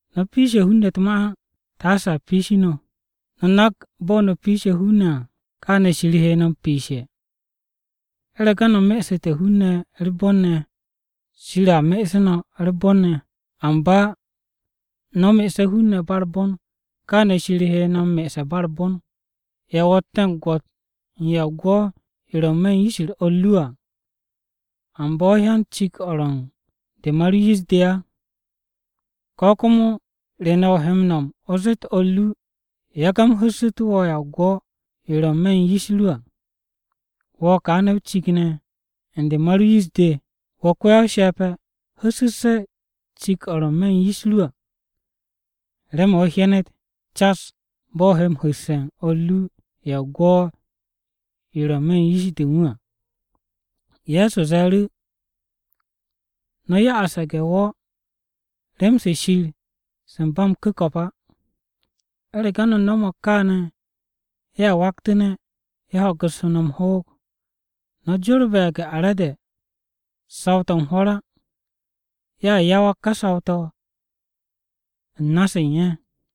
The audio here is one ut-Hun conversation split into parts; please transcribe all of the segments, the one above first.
“No̱ piishe̱ hun-ne̱ u̱t-ma á, taase a piishi no̱. No̱ nak bo̱ no̱ piishe̱ hun-ne̱ à, kaane̱ Shir he no̱ m-piishe̱. U̱rege̱ no̱ me'esu̱te̱ hun-ne̱ u̱r-bon ne̱, Shir a me'esu̱ no̱ u̱r-bon ne̱. Amba no̱ me'ese̱ hun-ne̱ ba u̱r-bon kaane̱ Shir he no̱ me'ese̱ ba u̱r-bon. “¿Ya o ro̱tte̱ gwo̱t u̱n ya o-gwo̱ yo ro̱ n-me̱ u̱n yish-u̱r o̱r ru à, amba wo̱ hyan cik-o̱ ro̱ u̱n de ma ru yish-de? ¿Ko̱ komo re ne̱ o he m-no̱m o zeet o̱r ru, ‘Yage̱ u̱m hu̱ssu̱tu̱ wo̱ ya gwo̱-yo ro̱ n-me̱ u̱n yish u̱n du à,’ wo̱ kaane̱ o-cik ne̱ u̱n de ma ru yish-de? Wo̱ ko-ya-o-she̱pe̱! Hu̱ssu̱sse̱ cik-o̱ ro̱ n-me̱ u̱n yish ru à, remen o hyenet cas bo̱ o he m-hu̱sse̱ u̱n o̱r ru ya o-gwo̱ yo ro̱ n-me̱ u̱n yish-de u̱n wu̱ à.” Ye̱so ze̱e̱ru̱, “No̱ ya'as ye̱ge̱-wo̱ rem-se Shir se ba m-ku̱ko̱p á. U̱rege̱ no̱ nomog kaane̱, ye̱a waktu̱ne̱ ye̱ ho̱gu̱ssu̱ no̱ m-hoog. No̱ jorbe̱ ye̱ge̱-are̱de saw-to̱ u̱n hwo̱r á! Ye̱a yawag ka saw-to̱ u̱s-na se u̱n ye̱.”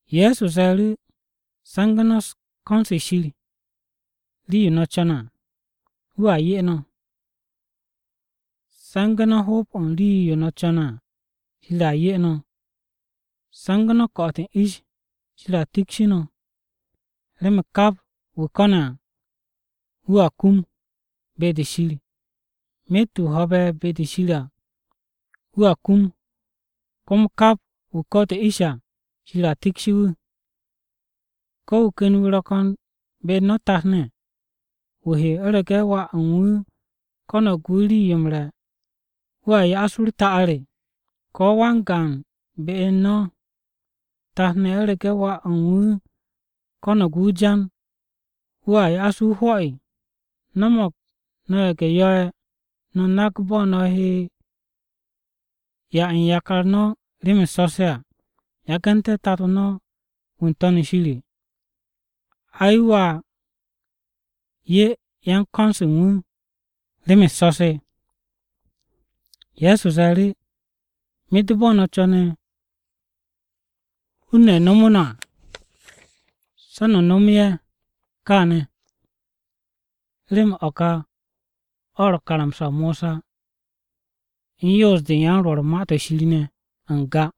Ye̱so ze̱e̱ru̱, “Se̱ngu̱ no̱ ko̱n-se Shir rii-yo no̱ co̱ne̱ à, wu̱a 'ye no̱. Se̱ngu̱ no̱ hoob-o rii-yo no̱ co̱ne̱ à, Shir a 'ye no̱. Se̱ngu̱ no̱ ko̱'o̱t u̱n ish, Shir a tikshi no̱. Remen kap wu̱ ko̱ne̱ à, wu̱a kum be-de Shir. Myet wu̱ ho̱be̱ be-de Shir à, wu̱a kum. Komo kap wu̱ ko̱'o̱te̱ ish à, Shir a tiksu̱ wu̱. “¿Ko̱, wu̱ ken wu̱ ro̱ ko̱n be-u̱r no̱ tat-ne̱, wu̱ he u̱rege̱ wà u̱n wu̱ ko̱no̱g wu̱ rii-yo m-re̱, wu̱a ya'as wu̱ u̱r-ta'ar? ¿Ko̱ wan-gaan be-u̱r no̱ tat-ne̱ u̱rege̱ wà u̱n wu̱ ko̱no̱g wu̱ o-jan, wu̱a ya'as wu̱ o-hwo̱? No̱mo̱g no̱ ye̱ge̱-yo̱-ye̱ no̱ nak bo̱ no̱ he m-'ya u̱n yakar no̱ rem-u̱s so̱-se à. Yagu̱nte̱ Tato no̱ wu̱ n-To̱n shir, ai wu̱a 'ye yan-ko̱n-se u̱n wu̱ rem-u̱s so̱-se!” Ye̱so ze̱e̱ru̱, “Myet bo̱ no̱ co̱ne̱ hun-ne̱ nomo no̱ à, se̱ no̱ nomotu̱ ye̱ kaane̱, remen o̱ ka o̱ ro̱ karamsa-o Mosa u̱n yoos-de u̱n yan-Rwo̱r u̱n Ma-to̱ Shir ne̱ n-ga.”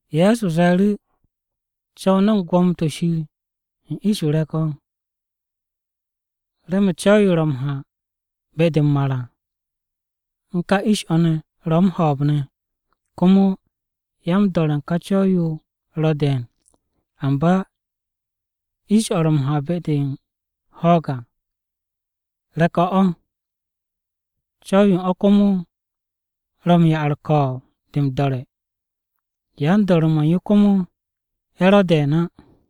Ye̱so ze̱e̱ru̱, “Co̱w no̱ u̱n gwo̱mo-to̱ Shir u̱n ish-o re̱k-o̱. Remen co̱w-yo ro̱ m-ha be-de m-mar à u̱n ka ish-o̱ ne̱ ro̱ m-ho̱o̱b ne̱. Komo ya-m-do̱re̱ u̱n ka co̱w-yo ro̱ de̱e̱n. Amba ish-o̱ ro̱ m-ha be-de u̱n ho̱o̱g à, re̱k-o̱ o̱. Co̱w-yo u̱n o̱ komo ro̱ m-'ya u̱r-ko̱o̱b de m-do̱re̱. Yan-do̱re̱-mo̱ u̱n yo komo ye̱ ro̱ de̱e̱n á.”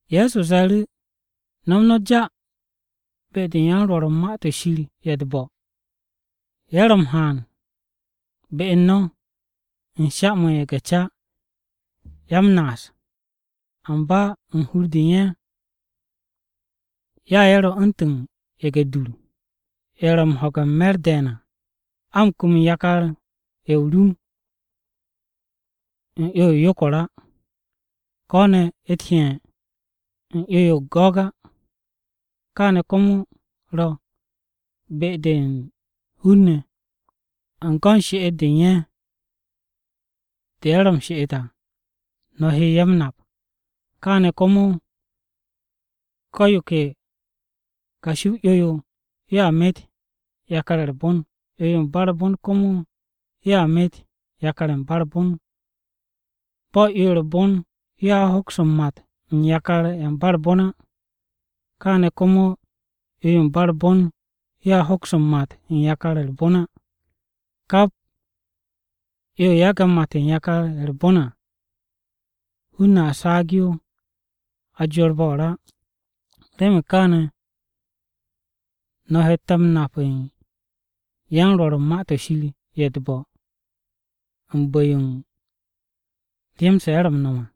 Ye̱so ze̱e̱ru̱, “No̱m no̱ ja be-de u̱n yan-Rwo̱r u̱n Ma-to̱ Shir ye̱ u̱t-bo̱. Ye̱ ro̱ m-haan be u̱n no̱ u̱n sha-mo̱ u̱n ye̱ge̱-ca ye̱ ro̱ m-naas á. Amba u̱n hur-de u̱n ye̱, ya ye̱ ro̱ u̱ntu̱n ye̱ge̱-dur, ye̱ ro̱ u̱n ho̱ge̱ u̱n me̱r de̱e̱n à. A m-kum u̱n yakar-ye̱ m-rum u̱n 'yo-yo o-yokor á, ko ne̱ u̱t-heye̱ u̱n 'yo-yo go̱g á. Kaane̱ komo ro̱ be-de u̱n hun-ne̱, u̱n go̱n she'et-de u̱n ye̱, de ye̱ ro̱ u̱r-she'et à, no̱ he ye̱ m-nap. Kaane̱ komo ko̱ yo ke kashi-o 'yo-yo yoa met yakar-ye̱ u̱r-bon, 'yo-yo u̱n ba u̱r-bon komo yo met yakar-ye̱ ba u̱r-bon. Bo̱ 'yo-yo u̱r-bon yoa hoks m-mat u̱n yakar-ye̱ ba u̱r-bon á, kaane̱ komo 'yo-yo ba u̱r-bon yoa hoks m-mat u̱n yakar-ye̱ u̱r-bon á. Kap 'yo-yo yage̱ mat u̱n yakar-ye̱ u̱r-bon à, hun-ne̱ a saag yo a jorbe̱ o-ra. Remen kaane̱ no̱ hette̱ m-nap u̱n yan-Rwo̱r u̱n Ma-to̱ Shir ye̱ u̱t-bo̱ u̱n bu̱-yo rem-se ye̱ m-no̱m à.”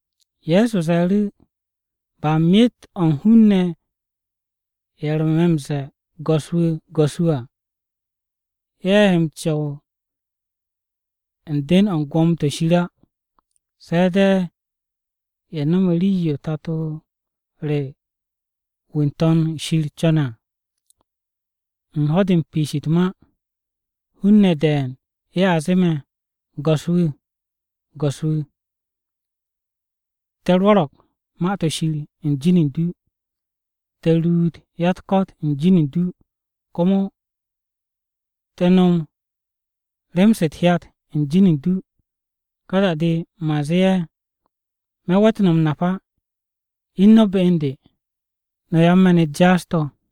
Ye̱so ze̱e̱ru̱, “Ba myet-o̱ u̱n hun-ne̱ ye̱ ro̱ me̱ m-ze̱e̱ ‘Go̱s-wu̱, Go̱s-wu̱ à,’ ye̱ he m-co̱w u̱n den-o̱ u̱n Gwo̱mo-to̱ o-Shir á. Se̱ de̱ ye̱ no̱me̱ rii-yo Tato re wu̱ n-To̱n shir co̱ne̱ à. U̱n ho̱-de piish u̱t-ma, hun-ne̱ de̱e̱n ye̱a zee me̱, ‘Go̱s-wu̱! Go̱s-wu̱! Te̱ rwo̱ro̱g Ma-to̱ Shir u̱n jin u̱n du! Te̱ ruut ya-u̱t-ko̱t u̱n jin u̱n du! Komo, te̱ no̱m rem-se u̱t-hyat u̱n jin u̱n du.’ Ka da-de man zee ye̱, ‘Me̱ we̱t no̱ m-nap á. Ine̱ no̱ be u̱n de, no̱ yan-me̱n-u̱t jaas-to̱.’”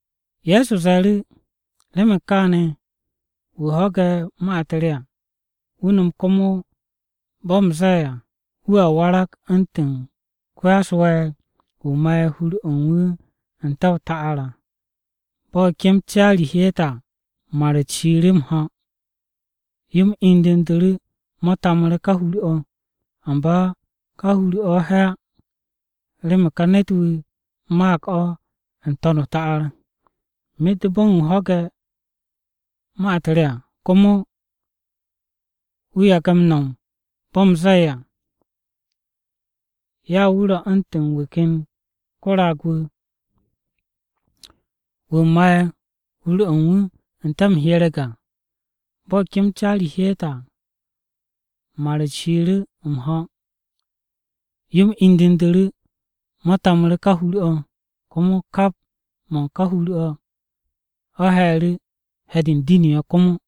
Ye̱so ze̱e̱ru̱, “Remen kaane̱, wu̱ ho̱ge̱ ka ma-u̱t re to̱ à, wu̱ nom komo bo̱ u̱m zee à, wu̱a warag u̱ntu̱n ko-ya-u̱s-we̱e̱r wu̱ ma'e̱ hur-o̱ u̱n wu̱ n-te̱ o-ta'ar à. Bo̱ kem caari hyeete̱ à, mar-u̱t shiiru̱ m-ho̱. Yo-m indu̱ndu̱ru̱ mo̱ tamu̱ru̱ ká hur-o̱. Amba ká hur-o̱ he̱ á, remen ká ne̱t-wu̱ maag o̱ n-to̱n o-ta'ar. Myet bo̱ u̱n wu̱ ho̱ge̱ ma-u̱t re à, komo wu̱ yage̱ m-no̱m bo̱ u̱m zee à. Ya wu̱ ro̱ u̱ntu̱n wu̱ ken ko-raag-wu̱, wu̱ ma'e̱ hur-o̱ u̱n wu̱ n-te̱ m-hyereg à. Bo̱ kem caari hyeete̱ à, mar-u̱t shiiru̱ m-ho̱, yo-m indu̱ndu̱ru̱ mo̱ tamu̱ru̱ ká hur-o̱. Komo kap mo̱ u̱n ká hur-o̱ he̱e̱ru̱, he̱-de u̱n diniyo̱ komo!”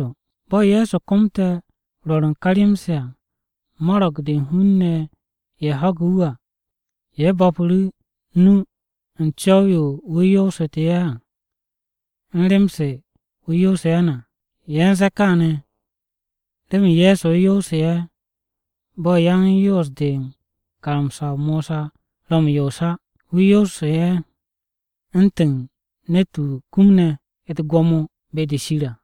Bo̱ Ye̱so komte̱ rwo̱r u̱n ka rem-se à, mo̱ro̱g-de u̱n hun-ne̱ ye̱ ho̱ge̱ wu̱ à, ye̱ bo̱pu̱ru̱ o-nu u̱n co̱w-yo wu̱ yoosu̱tu̱ ye̱ à u̱n rem-se wu̱ yoose̱ ye̱ ne̱ à. Ye̱ u̱n ze̱e̱ kaane̱, remen Ye̱so yoosu̱ ye̱ bo̱ yan-Yoos-de u̱n karamsa-o Mosa ro̱ m-yoos á. Wu̱ yoosu̱tu̱ ye̱ u̱ntu̱n ne̱t-wu̱ kumne̱ u̱t-gwo̱mo be-de Shir à.